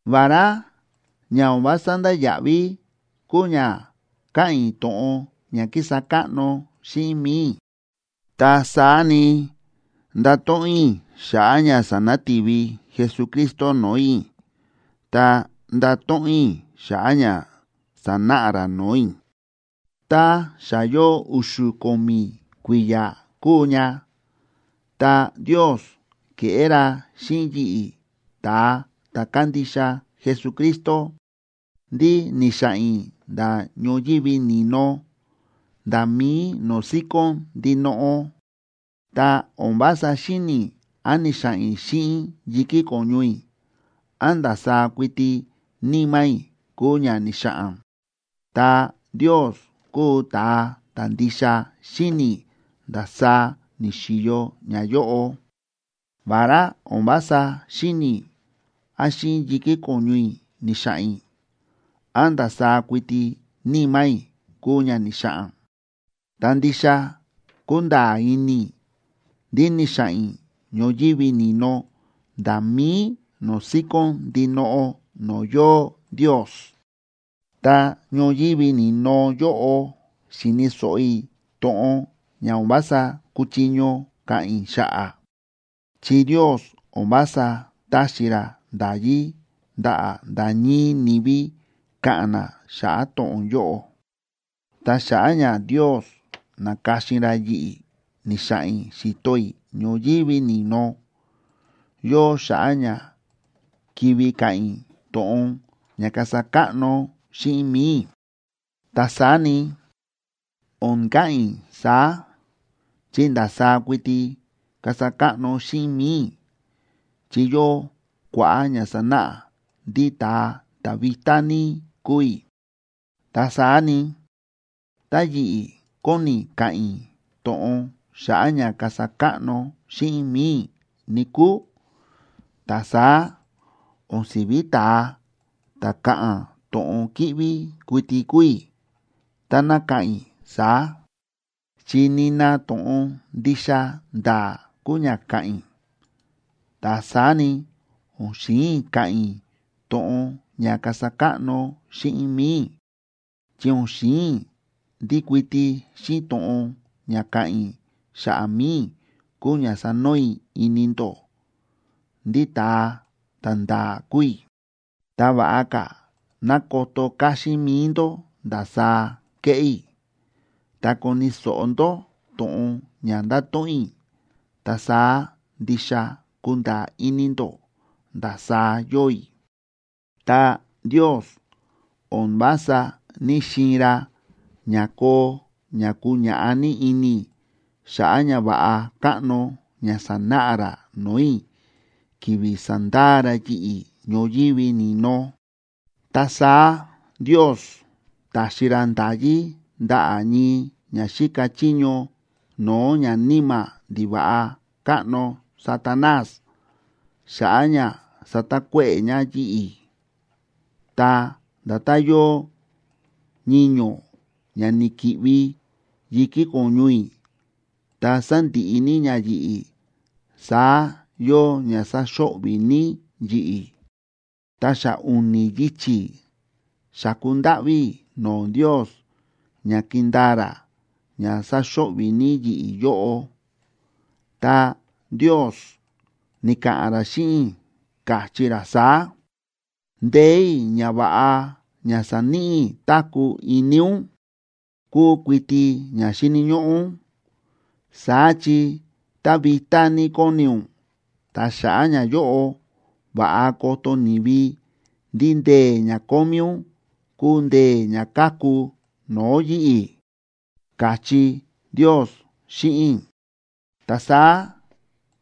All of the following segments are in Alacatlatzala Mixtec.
Vará ña o̱n vása ndáya̱ꞌví kúu ña káꞌa̱n i̱ to̱ꞌon ña kísa káꞌno xíꞌin mi̱i i̱, ta saá ni, ndato̱ꞌon i̱ xa̱ꞌa̱ ña sa̱nati̱vi Jesucristo no̱o̱ i̱, ta ndato̱ꞌon i̱ xa̱ꞌa̱ ña sa̱náꞌa ra no̱o̱ i̱. Ta xa yóo u̱xu̱ ko̱mi̱ kui̱ya̱ kúu ña, ta Ndios ke̱ꞌé ra xíꞌin yi̱ꞌi̱, ta̱a ta̱ kándixa Jesucristo, ndí ni̱xa̱ꞌa̱n i̱ nda̱ ñoyívi ni̱no nda̱ mí no̱o̱ síkón ndinoꞌo. (Ta o̱n vása xíni̱ i̱ án ni̱xa̱ꞌa̱n i̱ xíꞌin yi̱kí ko̱ñu i̱, án ndasaá kuiti níma̱ i̱ kúu ña ni̱xa̱ꞌa̱n. Ta Ndios kúu ta̱a ta̱ ndixa xíni̱ ndasaá ni̱xi̱yo ñayóꞌo.) Vará o̱n vása xíni̱ i̱ án xíꞌin yi̱kí ko̱ñu i̱ ni̱xa̱ꞌa̱n i̱, án ndasaá kuiti níma̱ i̱ kúu ña ni̱xa̱ꞌa̱n, ta ndixa kúnda̱a̱ ini i̱ ndí ni̱xa̱ꞌa̱n i̱ ñoyívi ni̱no nda̱ mí no̱o̱ síkón ndinoꞌo no̱o̱ yóo Ndios. Ta ñoyívi ni̱no yóꞌo xi̱ni̱ so̱ꞌo i̱ to̱ꞌon ña o̱n vása kúchiño ka̱ꞌa̱n i̱ xa̱ꞌa̱, chi Ndios o̱n vása táxi ra nda̱yí ndaꞌa̱ nda̱ ñii ni̱vi ka̱ꞌa̱n na xa̱ꞌa̱ to̱ꞌon yóꞌo. Ta xa̱ꞌa̱ ña Ndios na̱ka̱xin ra yi̱ꞌi̱ ni̱xa̱ꞌa̱n i̱ xi̱to i̱ ñoyívi ni̱no, yóo xa̱ꞌa̱ ña kivi ka̱ꞌa̱n i̱ to̱ꞌon ña kasa káꞌno xíꞌin mi̱i i̱. Ta saá ni, o̱n ka̱ꞌa̱n i̱ saá, chi ndasaá kuiti kasa káꞌno xíꞌin mi̱i i̱ chi yóo kua̱ꞌa̱ ña sánáꞌa ndí ta̱a ta̱ vitá ní kúu i̱. Ta saá ni, tá yi̱ꞌi̱ kóni i̱ ka̱ꞌa̱n i̱ to̱ꞌon xa̱ꞌa̱ ña kasa káꞌno xíꞌin mi̱i i̱, níkúu, ta saá o̱n si̱ví ta̱a ta̱ ka̱ꞌa̱n to̱ꞌon kíꞌví kuiti kuu i̱ táná ka̱ꞌa̱n i̱ saá, chi nina to̱ꞌon ndixa nda̱a̱ kuu ña ka̱ꞌa̱n i̱. Ta saá ni, o̱n xi̱in i̱ ka̱ꞌa̱n i̱ to̱ꞌon ña kasa káꞌno xíꞌin mi̱i i̱, chi o̱n xi̱in i̱ ndí kuiti xíꞌin to̱ꞌon ña ka̱ꞌa̱n i̱ xa̱ꞌa̱ mi̱i i̱ kuu ña sanoo i̱ ini ndó ndí ta̱a ta̱nda̱a̱ kúu i̱. Ta va̱ꞌa ka̱ ná koto káxín mi̱i ndó ndasaá kéꞌé i̱, ta koni̱ so̱ꞌo ndó to̱ꞌon ña ndáto̱ꞌon i̱, ta saá ndixa kunda̱a̱ ini ndó ndasaá yóo i̱. Ta Ndios o̱n vása ní‑xiin ra ña koo ña kuñaꞌá ní ini i̱ xa̱ꞌa̱ ñava̱ꞌa káꞌno ña sa̱náꞌa ra no̱o̱ i̱ ki̱vi̱ sa̱ndaa ra yi̱ꞌi̱ ñoyívi ni̱no. Ta saá Ndios ta̱xi ra nda̱yí ndaꞌa̱ ñii ña xíka chiño no̱o̱ ñaníma̱ ndiva̱ꞌa káꞌno Satanás xa̱ꞌa̱ ña satakuéꞌe̱ ña yi̱ꞌi̱. Ta nda̱tán yóo ñiño̱ ña ni̱ki̱ꞌvi yi̱kí ko̱ñu i̱, ta sándiꞌi ní ña yi̱ꞌi̱, saá yóo ña sáxo̱ꞌvi̱ ní yi̱ꞌi̱. Ta xa u̱ni̱ yichi̱ xa̱ku ndáꞌví i̱ no̱o̱ Ndios ña kindaa ra ña sáxo̱ꞌvi̱ ní yi̱ꞌi̱ yóꞌo. Ta Ndios ni̱ka̱ꞌa̱n ra xíꞌin i̱, káchí ra saá: “Ndee̱ i̱ ña va̱ꞌa ña sa̱níꞌi i̱ táku̱ ini ún kúu kuiti ña xíni̱ ñóꞌó ún. Saá chi tá vitá ní kóni ún, ta xa̱ꞌa̱ ñayóꞌo va̱ꞌa koto ni̱vi ndí ndee̱ ña kómí ún kúu ndee̱ ña káku no̱o̱ yi̱ꞌi̱”, káchí Ndios xíꞌin i̱. Ta saá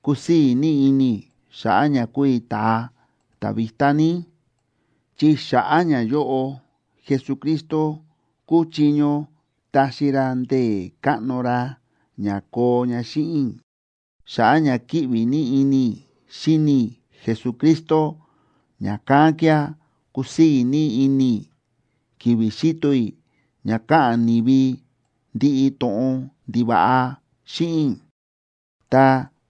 kúsii̱ ní ini i̱ xa̱ꞌa̱ ña kúu i̱ ta̱a ta̱ vitá ní, chi xa̱ꞌa̱ ñayóꞌo, Jesucristo kúchiño taxi ra ndee̱ káꞌno ra ña koo ña xíꞌin i̱. Xa̱ꞌa̱ ña kíꞌvi ní ini i̱ xíni i̱ Jesucristo, ña̱kán kía̱ kúsii̱ ní ini i̱ ki̱vi̱ xíto i̱ ña káꞌa̱n ni̱vi ndiꞌi to̱ꞌon ndiva̱ꞌa xíꞌin i̱, ta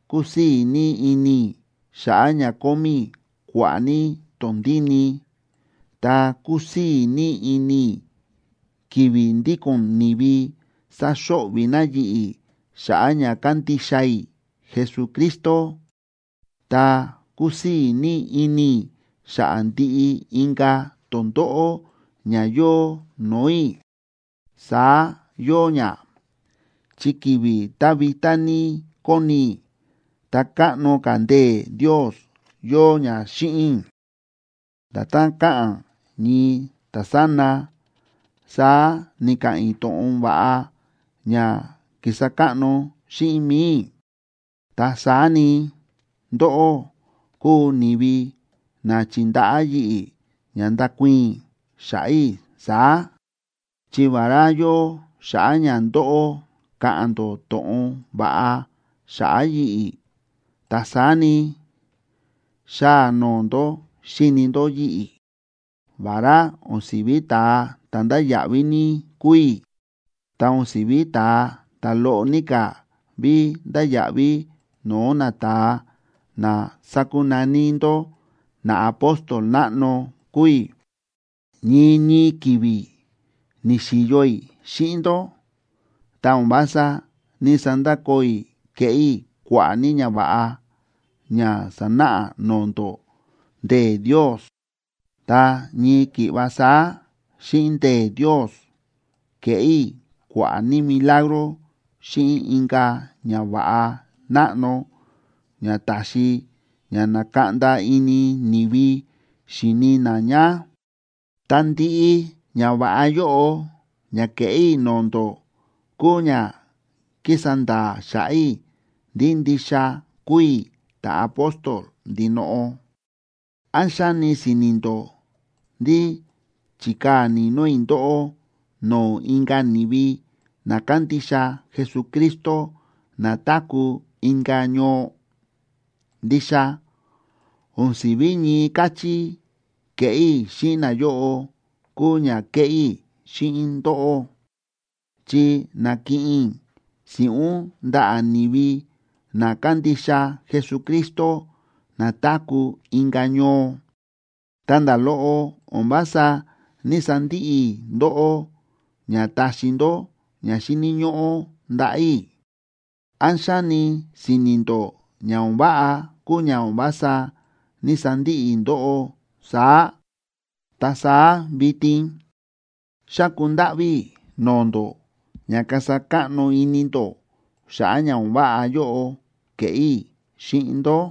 kúsii̱ ní ini i̱ xa̱ꞌa̱ ña kómí i̱ kua̱ꞌa̱ ní tondíni, ta kúsii̱ ní ini i̱ ki̱vi̱ ndíko̱n ni̱vi sáxo̱ꞌvi̱ na yi̱ꞌi̱ xa̱ꞌa̱ ña kándixa i̱ Jesucristo, ta kúsii̱ ní ini i̱ xa̱ꞌa̱ ndiꞌi inka̱ tondóꞌó ña yóo no̱o̱ i̱. Saá yóo ña, chi ki̱vi̱ tá vitá ní kóni i̱, ta káꞌno ka̱ ndee̱ Ndios yóo ña xíꞌin i̱. Nda̱tán káꞌa̱n ñii ta̱sána, saá ni̱ka̱ꞌa̱n i̱ to̱ꞌon va̱ꞌa ña kísa káꞌno xíꞌin mi̱i i̱. Ta saá ni, ndóꞌó kúu ni̱vi na chi̱ndaꞌá yi̱ꞌi̱ ña nda̱kuii̱n i̱ xa̱ꞌa̱ i̱ saá. Chi vará yóo xa̱ꞌa̱ ña ndóꞌó ka̱ꞌa̱n ndó to̱ꞌon va̱ꞌa xa̱ꞌa̱ yi̱ꞌi̱, ta saá ni, xáa noo ndó xíni ndó yi̱ꞌi̱. Vará o̱n si̱ví ta̱a ta̱ ndáya̱ꞌví ní kúu i̱, ta o̱n si̱ví ta̱a ta̱ loꞌo ní ka̱ ví ndáya̱ꞌví no̱o̱ nata̱a na sákunaní ndó “naapóstol náꞌno” kúu i̱. Ñii ñii ki̱vi̱ ni̱xi̱yo i̱ xíꞌin ndó, ta o̱n vása ní‑sandakoo i̱ kéꞌé i̱ kua̱ꞌa̱ ní ñava̱ꞌa ña sa̱náꞌa no̱o̱ ndó ndee̱ Ndios, ta ñii ki̱ꞌva saá xíꞌin ndee̱ Ndios ke̱ꞌé i̱ kua̱ꞌa̱ ní milagro xíꞌin inka̱ ñava̱ꞌa náꞌno ña ta̱xi ña na̱kaꞌnda ini ni̱vi xi̱ni na ña. Ta ndiꞌi ñava̱ꞌa yóꞌo ña ke̱ꞌé i̱ no̱o̱ ndó kúu ña kísa nda̱a̱ xa̱ꞌa̱ i̱ ndí ndixa kúu i̱ ta̱apóstol ndinoꞌo. ¿Án xáni si̱ni̱ ndó ndí chi̱kaa̱ ni̱no̱ i̱ ndóꞌó no̱o̱ inka̱ ni̱vi na kándixa Jesucristo na táku̱ inka̱ ñoo? Ndixa o̱n si̱ví ñii káchí ke̱ꞌé i̱ xíꞌin nayóꞌo kúu ña kéꞌé i̱ xíꞌin ndóꞌó, chi na̱kiꞌin i̱ si̱ꞌún ndaꞌa̱ ni̱vi na kándixa Jesucristo na táku̱ inka̱ ñoo, ta nda̱ loꞌo o̱n vása ní‑sandiꞌi i̱ ndóꞌó ña taxi ndó ña xíni̱ ñóꞌó ndaꞌa̱ i̱. ¿Án xáni si̱ni̱ ndó ña o̱n váꞌa kúu ña o̱n vása ní‑sandiꞌi i̱ ndóꞌó saá? Ta saá vitin, ¡xáku ndáꞌví i̱ no̱o̱ ndó ña kasa káꞌno ini ndó xa̱ꞌa̱ ña o̱n váꞌa yóꞌo ke̱ꞌé i̱ xíꞌin ndó!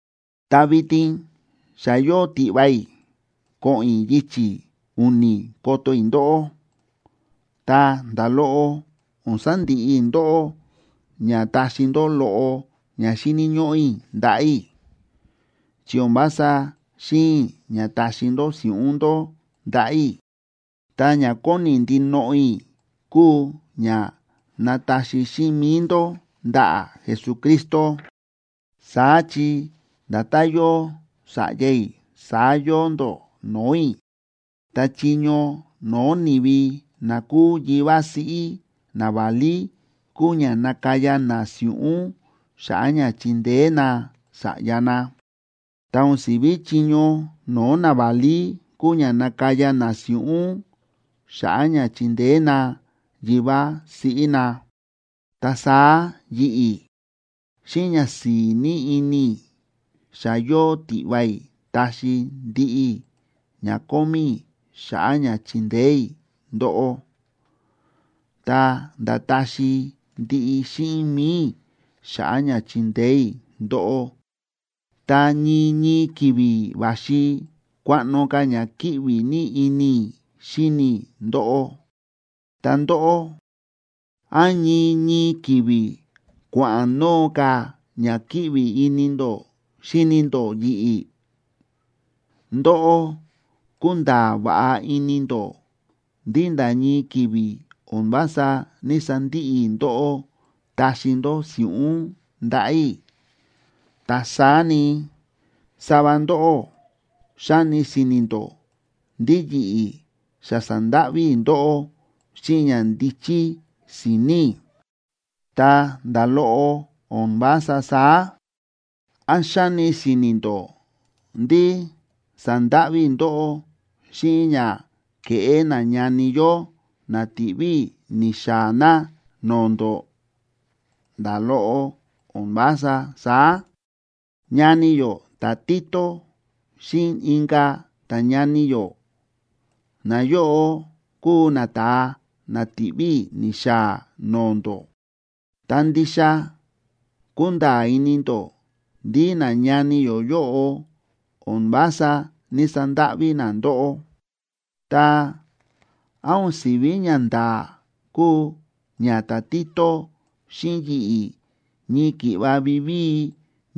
Ta vitin xa yóo tiꞌva i̱ ko̱ꞌo̱n i̱ yichi̱ u̱ni̱ koto i̱ ndóꞌó. Ta nda̱ loꞌo o̱n sandiꞌi i̱ ndóꞌó ña taxi ndó loꞌo ña xíni̱ ñóꞌó i̱ ndaꞌa̱ i̱. Chi o̱n vása xi̱in i̱ ña taxi ndó si̱ꞌún ndó ndaꞌa̱ i̱, ta ña kóni ndinoꞌo i̱ kúu ña nataxi xíꞌin mi̱i ndó ndaꞌa̱ Jesucristo. Saá chi nda̱tán yóo sa̱ꞌya i̱, saá yóo ndó no̱o̱ i̱. Ta chiño no̱o̱ ni̱vi na kúu yivá siꞌí naválí kúu ña nakaya na si̱ꞌún xa̱ꞌa̱ ña chindeé na sa̱ꞌya na, ta o̱n si̱vi chiño no̱o̱ naválí kúu ña nakaya na si̱ꞌún xa̱ꞌa̱ ña chindeé na yivá siꞌí na. Ta saá yi̱ꞌi̱, xíꞌin ñasi̱i̱ ní ini i̱ xa yóo tiꞌva i̱ taxi i̱ ndiꞌi ña kómí i̱ xa̱ꞌa̱ ña chindeé i̱ ndóꞌó, ta̱nda̱ taxi ndiꞌi xíꞌin mi̱i i̱ xa̱ꞌa̱ ña chindeé i̱ ndóꞌó. Ta ñii ñii ki̱vi̱ va̱xi kuaꞌno ka̱ ña kíꞌvi ní ini i̱ xíni i̱ ndóꞌó, ta ndóꞌó, ¿án ñii ñii ki̱vi̱ kua̱ꞌa̱n noo ka̱ ña kíꞌvi ini ndó xíni ndó yi̱ꞌi̱? Ndóꞌó kúnda̱a̱ va̱ꞌa ini ndó ndí nda̱ ñii ki̱vi̱ o̱n vása ní‑sandiꞌi i̱ ndóꞌó taxi ndó si̱ꞌún ndaꞌa̱ i̱. Ta saá ni, sava ndóꞌó xáni si̱ni̱ ndó ndí yi̱ꞌi̱ xa sa̱ndáꞌví i̱ ndóꞌó xíꞌin ñandíchí si̱ni̱ i̱. Ta nda̱ loꞌo o̱n vása saá. ¿Án xáni si̱ni̱ ndó ndí sa̱ndáꞌví i̱ ndóꞌó xíꞌin ña kéꞌé nañani yó na ti̱ꞌví i̱ ni̱xaa̱ na no̱o̱ ndó? Nda̱ loꞌo o̱n vása saá. Ñani yó ta̱Tito xíꞌin inka̱ ta̱ñani yó, nayóꞌo kúu nata̱a na ti̱ꞌví i̱ ni̱xaa̱ no̱o̱ ndó. Ta ndixa kúnda̱a̱ ini ndó ndí nañani yó yóꞌo o̱n vása ní‑sandáꞌví na ndóꞌó. Ta, ¿án o̱n si̱ví ñanda̱a̱ kúu ña ta̱Tito xíꞌin yi̱ꞌi̱ ñii ki̱ꞌva vivíi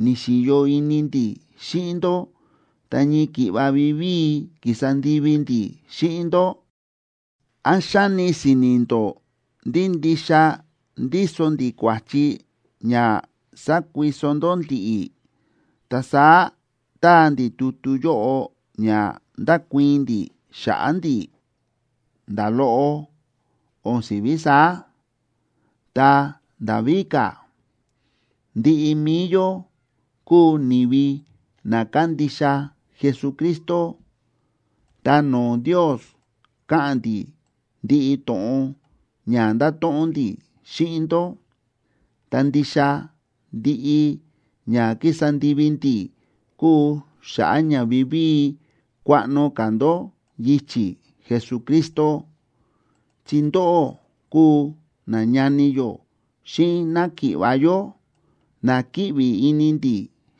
ni̱xi̱yo ini ndi̱ xíꞌin ndó, ta ñii ki̱ꞌva vivíi ki̱sa ndivi ndi̱ xíꞌin ndó? ¿Án xáni si̱ni̱ ndó ndí ndixa ndíso ndi̱ kua̱chi ña sákuiso ndó ndi̱ꞌi̱, ta saá táa ndi̱ tutu yóꞌo ña ndakuii̱n ndi̱ xa̱ꞌa̱ ndi̱? Nda̱ loꞌo o̱n si̱ví saá. Ta nda̱ víka̱, ndiꞌi mi̱i yó kúu ni̱vi na kándixa Jesucristo, ta no̱o̱ Ndios káꞌa̱n ndi̱ ndiꞌi to̱ꞌon ña ndáto̱ꞌon ndi̱ xíꞌin ndó. Ta ndixa ndiꞌi ña kísa ndivi ndi̱ kúu xa̱ꞌa̱ ña vivíi kuaꞌno ka̱ ndó yichi̱ Jesucristo, chi ndóꞌó kúu nañani yó xíꞌin náki̱ꞌva̱ yó, na kíꞌvi ini ndi̱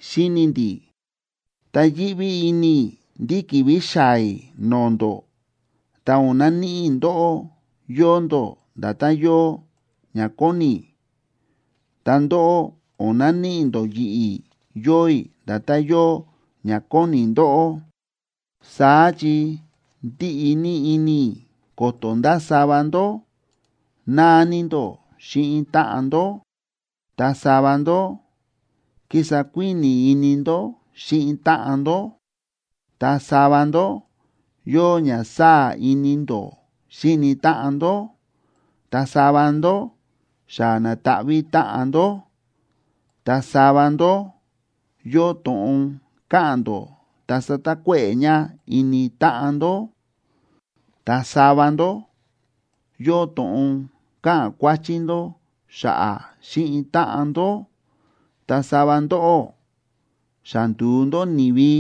xíni ndi̱. Ta yíꞌví ini i̱ ndí ki̱vi̱ xaa̱ i̱ no̱o̱ ndó, ta o̱n naníꞌi i̱ ndóꞌó yóo ndó nda̱tán yóo ña kóni i̱, ta ndóꞌó, o̱n naníꞌi ndó yi̱ꞌi̱ yóo i̱ nda̱tán yóo ña kóni ndóꞌó. Saá chi ndíꞌi ní ini i̱ ko̱to̱ nda̱ sava ndó náa ní ndó xíꞌin táꞌan ndó, ta sava ndó kísa kuíni̱ ini ndó xíni táꞌan ndó, ta sava ndó yóo ña sáa̱ ini ndó xíni táꞌan ndó, ta sava ndó xa na̱taꞌví táꞌan ndó, ta sava ndó yóo to̱ꞌon káꞌa̱n ndó ta sátakuéꞌe̱ ña ini táꞌan ndó, ta sava ndó yóo to̱ꞌon káꞌa̱n kuáchí ndó xa̱ꞌa̱ xíꞌin táꞌan ndó, ta sava ndóꞌó xa ndu̱u ndó ni̱vi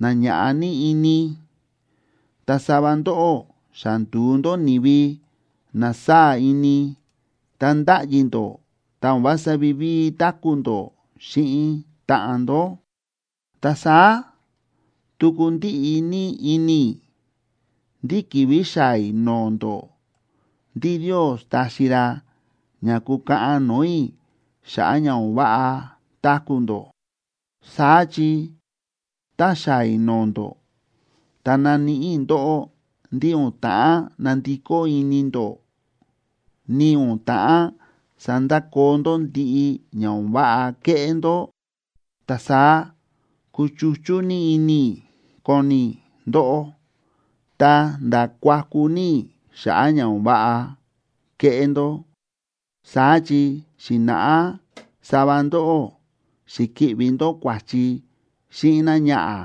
na ña̱ꞌa ní ini, ta sava ndóꞌó xa ndu̱u ndó ni̱vi na sáa̱ ini ta ndáꞌyi ndó ta o̱n vása vivíi táku̱ ndó xíꞌin táꞌan ndó. Ta saá tuku ndíꞌi ní ini i̱ ndí ki̱vi̱ xaa̱ i̱ no̱o̱ ndó ndí Ndios taxi ra ña kukaꞌan no̱o̱ i̱ xa̱ꞌa̱ ña o̱n váꞌa táku̱ ndó. Saá chi tá xaa̱ i̱ no̱o̱ ndó, ta naníꞌi i̱ ndóꞌó ndí o̱n ta̱ꞌán nandikó ini ndó, ni o̱n ta̱ꞌán sandakoo ndó ndiꞌi ña o̱n váꞌa kéꞌé ndó, ta saá kuchuchú ní ini i̱ koni i̱ ndóꞌó, ta̱nda̱ kuaku ní i̱ xa̱ꞌa̱ ña o̱n váꞌa kéꞌé ndó. Saá chi xi̱na̱ꞌá sava ndó xi̱ki̱ꞌvi ndó kua̱chi xíꞌin náñaꞌa̱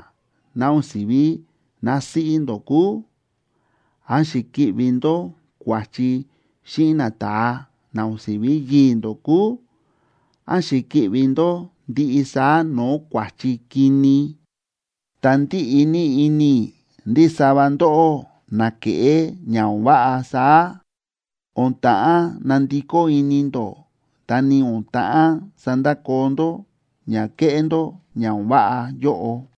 ná o̱n si̱ví násíꞌí ndó kúu, án xi̱ki̱ꞌvi ndó kua̱chi xíꞌin nata̱a na o̱n si̱ví yii̱ ndó kúu, án xi̱ki̱ꞌvi ndó ndiꞌi saá no̱o̱ kua̱chi kini. Ta ndíꞌi ní ini i̱ ndí sava ndóꞌó na ke̱ꞌé ña o̱n váꞌa saá, o̱n ta̱ꞌán nandikó ini ndó, ta ni o̱n ta̱ꞌán sandakoo ndó ña kéꞌé ndó ña o̱n váꞌa yóꞌo.